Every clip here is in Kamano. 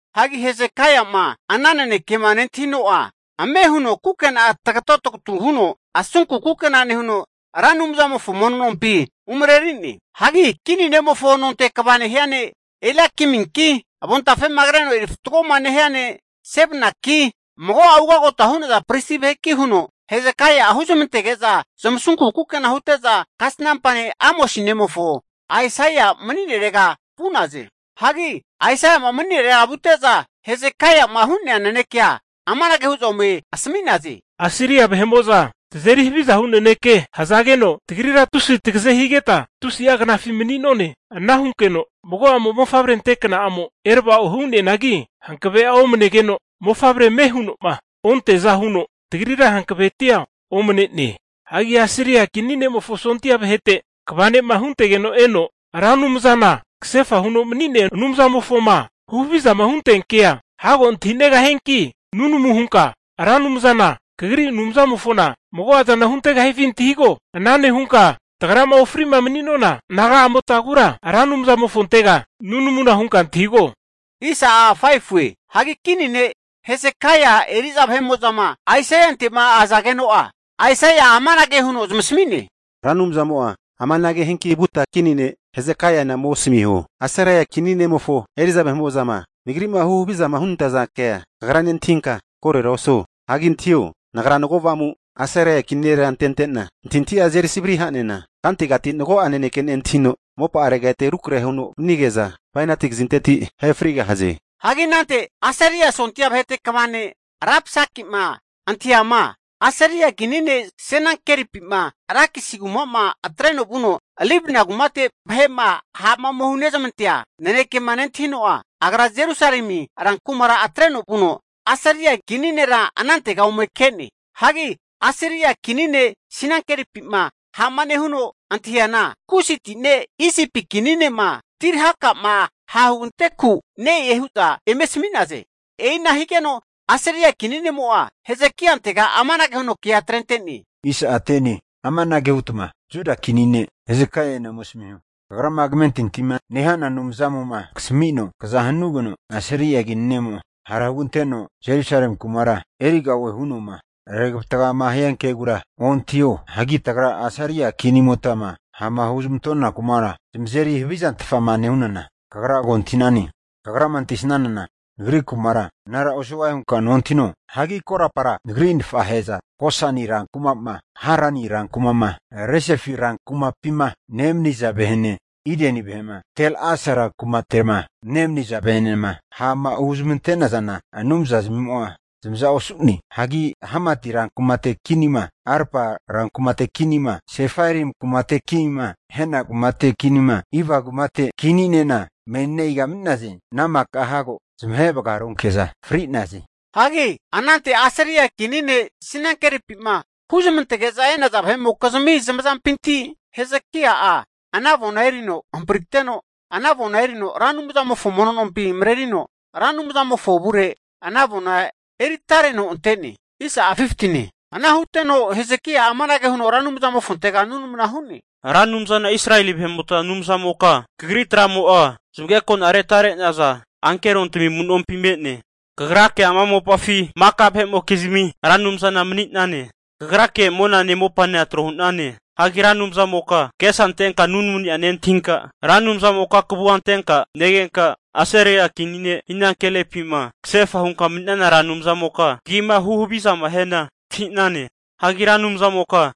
Hagi Hezekaia'ma ana nanekema nentahino'a ame huno kukena'a tagato tagatu huno asunku kukena nehuno, Ra Anumzamofo mono nompi umareri'ne. Hagi kini ne'mofo nonte kva nehia ne' Eliakiminki, avontafe'ma kreno eri fatgoma nehia ne' Sebnanki, mago'a ugagota hu'naza pristi vaheki huno Hezekai'a huzmantege'za zamasunku kukena hute'za kasnampa ne' Amosi nemofo Aisaia mani'nerega vu'naze. Hagi Aisaia'ma mani'nere vute'za Hezekaia'ma hu'nea nanekea amanage hu'za ome asami'naze, Asiria vahe'mo'za tazeri haviza hu naneke hazageno tagrira tusi tagaze higeta tusi'a knafi mani'none. Ana hunkeno mago a'mo mofavre ante kna'amo erava'o hu'neanagi, hankave'a omnegeno mofavrea ame huno'ma onteaza huno, tagrira hankavetia omne'ne. Hagi Asiria kini ne'mofo sondia vahete kva ne'ma huntegeno eno Ra Anumzana kasefa huno mani'nea Anumzamofoma huhavizama hunteankea, hago antahinegahianki nunamuna hunka Ra Anumzana kagri Anumzamofona mago'azana huntegahifi antahigo. Ana nehunka tagrama ofri'ma mani'nona naga'amotagura Ra Anumzamofontega nunamuna hunka antahigo. Hagi kini ne' Hezekaia eri'za vahe'mo'zama Aisaiante'ma azageno'a, Aisaia'a amanage huno zamasami'ne, Ra Anumzamo'a amanage hianki vuta kini ne' Hesekaiana ome asmiho, Asiria kini ne'mofo eri'za vahe'mo'zama Nagri'ma huhavizama hunantaza kea kagra nentahinka korora osuo. Hagi antahio! Nagra mago avamu Asiria kini nera antente'na antahintahi'a azeri savri ha'nena, kantegati mago'a naneke nentahino, mopa'arega ete rukrahe huno vanige'za bainati kazinteti ahe frigahaze. Hagi anante Asiria sondia vahete kva ne' Rabsakima antahiama, Asiria kini ne' Senakeripima Lakisi kuma'ma atreno vuno Libna kumate vahe'ma ha'ma ome hunezmantea nanekema nentahino'a, agra Jerusalemi rankumara atreno vuno Asiria kini nera anantega ome ke'ne. Hagi Asiria kini ne' Senakeripi'ma ha'ma nehuno antahiana, Kusiti ne' Isipi kini ne'ma Tirhaka'ma hahuganteku ne'e hu'za eme asami'naze. E'ina higeno Asiria kini ne'mo'a Hezekaiantega amanage huno kea atrente'ne. Amanage hutma Juda kini ne' Hezekaiana ome asmiho, kagrama kamentintima nehana Anumzamo'ma kasamino, kza hanugeno Asiria kini ne'mo'a hara huganteno Jerusalemi kumara e'origahie huno'ma regavatgama hiankegura ontahio. Hagi tagra Asiria kinimotama ha'ma huzmantona kuma'ma zamazeri havizantfama nehunana kagra ko antahi'nane. Kagrama antahisanana nagri kumara anara osugahie hunka nentahino? Hagi korapara nagri nafahe'za, Gosani rankuma'ma, Harani rankuma'ma, Rezefi rankumapima nemaniza vahe'ene, Ideni vahe'ma Tel-Asa rankumate'ma nemaniza vahe'enema ha'ma huzmante'nazana anumza zamimo'a zamaza osu'ne. Hagi Hamati rankumate kinima, Arpa kumate kinima, Sefarvaimi kumate kinima, Hena kumate kinima, Iva rankumate kininena menina iga mani'naze? Ana maka hago zamahe vagaronke'za fri'naze. Hagi anante Asiria kini ne' Senakeripi'ma huzmantege'za e'naza vahe'mokizmi zamazampinti, Hezekaia'a ana avona erino hampriteno, ana avona erino Ra Anumzamofo mono nompi marerino, Ra Anumzamofo avure ana avona eritareno ante'ne. Ana huteno Hezekaia'a amanage huno Ra Anumzamofontega nunamuna hu'ne, Ra Anumzana Israeli vahe'mota Anumzamoka, Kagri tra'mo'a zamagekona retare'naza ankerontami amu'nompi me'ne. Kagrake ama mopafi maka vahe'mokizmi Ra Anumzana mani'nane. Kagrake monane mopanena tro hu'nane. Hagi Ra Anumzamoka kagesa antenka nunamuni'a nentahinka, Ra Anumzamoka kavua antenka negenka, Asiria kini ne' Senakeripi'ma kasefa hunka mani'nana Ra Anumzamoka kagima huhavizama hiana antahi'nane. Hagi tamage, Ra Anumzamoka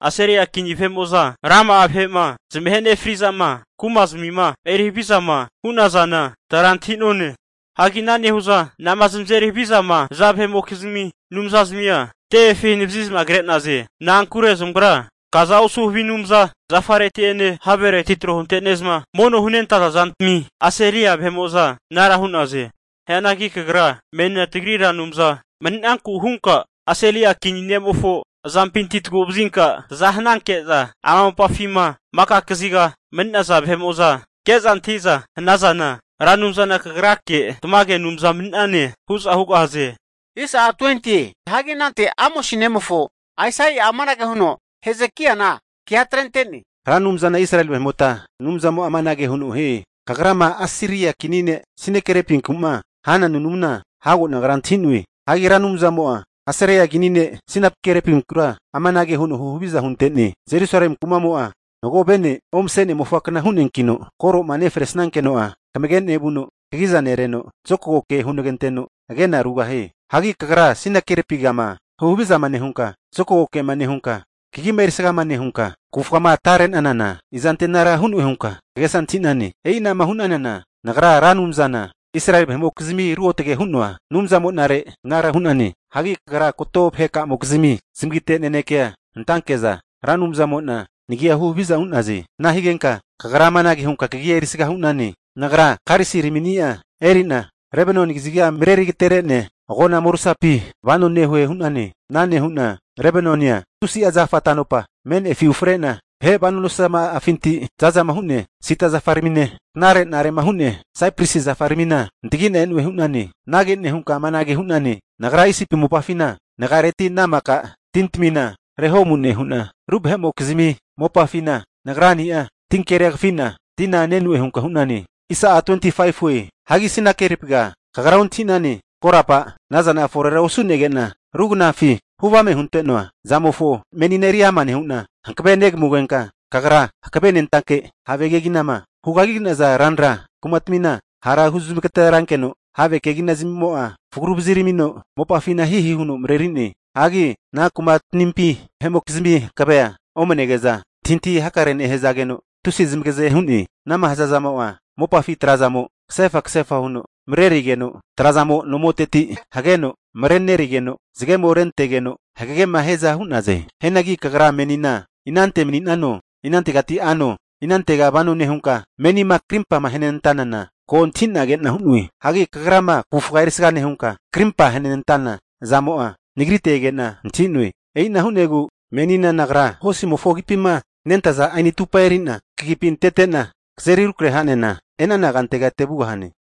Asiria kini vahe'mo'za rama'a vahe'ma zamahe nefri'zama, kuma'zamima eri havizama hu'nazana tagra antahi'none. Hagi ana nehu'za, anama zamazeri havizama haza vahe'mokizmi anumzazamia tevefi hanavazi'za kre'naze. Na'ankure zamagra kaza osu havi anumza zafareti'ene, havereti tro huntene'za mono hunentaza zantami Asiria vahe'mo'za anara hu'naze. Hianagi kagra menina tagri Ra Anumza mani'nanku hunka Asiria kini ne'mofo azampintira tagu'vazinka taza hananke'za, ama mopafima maka kaziga mani'naza ke'za antahi'za hanazana, Ra Anumzana kagrake tamage Anumza mani'nane hu'za hugahaze. Hagi anante Amosi nemofo Aisaia'a amanage huno Hezekaina kea atrente'ne, Ra Anumzana Israeli vahe'mota Anumzamo'a amanage huno hie, kagrama Asiria kini ne' Senakeripinku'ma hana nunamuna hago nagra antahi'noe. Hagi Ra Anumzamo'a Asiria kini ne' Senakeripinkura amanage huno huhaviza hunte'ne. Jerusalemi kumamo'a mago vene omase'nea mofakna hu'neankino, koroma nefresankeno'a kamage nevuno kagiza nereno, zokago ke huneganteno, agena rugahie. Hagi kagra Senakeripigama huhavizama nehunka, zokago kema nehunka, kagima erisgama nehunka, kavufgama atare'nanana, izante anara hu'noe hunka kagesa antahi'nane? E'ina'ma hu'nanana Nagra Ra Anumzana Israeli vahe'mokizmi ruotage hu'noa Anumzamo'nare anara hu'nane. Hagi kagra kato vaheka'amokizmi zamagite nanekea antanke'za Ra Anumzamo'na nagia huhaviza hu'naze. Ana higenka kagra amanage hunka kagia erisga hu'nane. Nagra karisiramini'a eri'na Lebanoni kaziga mareri agatere'nea agona morusapi vano nehue hu'nane. Ana nehu'na Lebanonia tusi'a zafa ta'nopa me'nefi ufre'na, vahe vano nosazama'afinti, zaza'ma hu'nea sida zafaramine, knarenare'ma hu'nea saipresi zafaramina antagi'na e'noe hu'nane. Anage nehunka amanage hu'nane, Nagra Isipi mopafina nagiareti ana maka tintamina reho'mu nehu'na, ru vahe'mokizmi mopafina nagrani'a tinkeria kafi'na tina ne'noe hunka hu'nane. Hagi Senakeripiga kagra ontahi'nane, korapa ana zana forera osu'nege'na, Nagra ru knafi huvame hunte'noa zamofo menina eriama nehu'na hankavea negamugenka, kagra hankave nentake have keginama hugagi'naza ranra kumatmina, hara huzmagaterankeno, have kegina zamimo'a fragu vaziramino mopafina hihi huno mareri'ne. Hagi ana kumatmimpi vahe'mokizmi hankavea omnege'za, antahintahi hakare nehazageno tusi zamagaze hu'ne. Anama hazazamo'a mopafi tra'zamo kasefa kasefa huno marenerigeno, trazamo nomoteti hageno marenerigeno zagemo'ma rentegeno hagegema hiaza hu'naze. Hianagi kagra menina inante mani'nano, inantegati ano, inantega vano nehunka, menima krimpama ahenantanana ko antahi'na ke'na hu'noe. Hagi kagrama kavufga erisga nehunka, krimpa ahenantana zamo'a Nagrite ege'na antahi'noe. E'ina hu'negu menina Nagra hosimofo agipima renentaza ani atupa eri'na kagipi antete'na, kazeri rukrahe ha'nena e'nana kantega ete vugahane.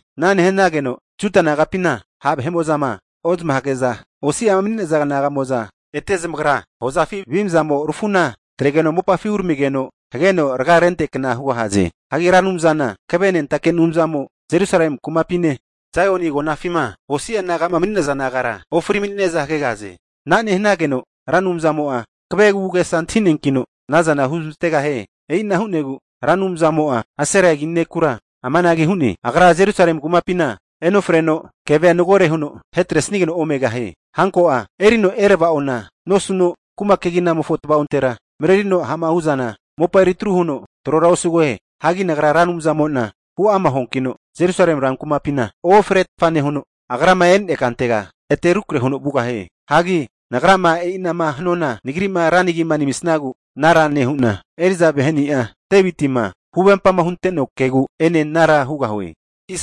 Ana nehanageno Juda nagapima ha' vahe'mo'zama ozmahage'za osi'ama mani'naza naga'mo'za ete zamagra hozafi avimzamo rafu'na atregeno mopafi uneramigeno, hageno raga renteankna hugahaze. Hagi Ra Anumzana hankavenentake Anumzamo Jerusalemi kumapine, Zaioni agonafima osi'a naga'ma mani'naza nagara, ofri mani'ne'za hagegahaze. Ana nehanageno Ra Anumzamo'a hankave agu'agesa antahi'neankino, anazana huzmantegahie. E'ina hu'negu Ra Anumzamo'a Asiria kini nekura amanage hu'ne, agra Jerusalemi kumapina enofreno, kevea magore huno ahetresigeno omegahie. Hanko'a erino erava'ona nosuno, kuma keginamofo tvaontera marerino ha'ma hu'zana mopa eritru huno trora osugahie. Hagi Nagra Ra Anumzamo'na huama huankino, Jerusalemi rankumapina eofretfa nehuno, agrama e'nea kantega ete rukrahe huno vugahie. Hagi Nagrama e'inama hanuana Nagri'ma ra nagima namisagu anara nehu'na, eri'za vaheni'a Devitima huvempama hunte'noa kegu ene anara hugahue.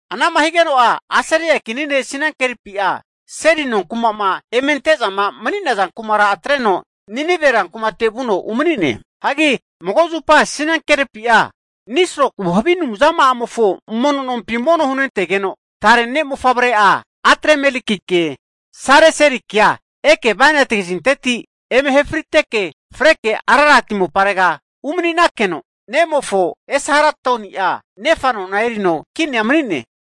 Anama higeno'a Asiria kini ne' Senakeripi'a seli nonkuma'ma eme ante'zama mani'naza kumara atreno Ninive rankumate vuno umani'ne. Hagi mago zupa Senakeripi'a Nisroku havi anumzama'amofo mono nompi mono hunentegeno, tare ne'mofavre'a Adramelekike Sareserikea eke bainati kazinteti eme ahe friteke, freke Ararati moparega umanikeno, nemofo Esarhadoni'a nefa nona erino kinia mani'ne.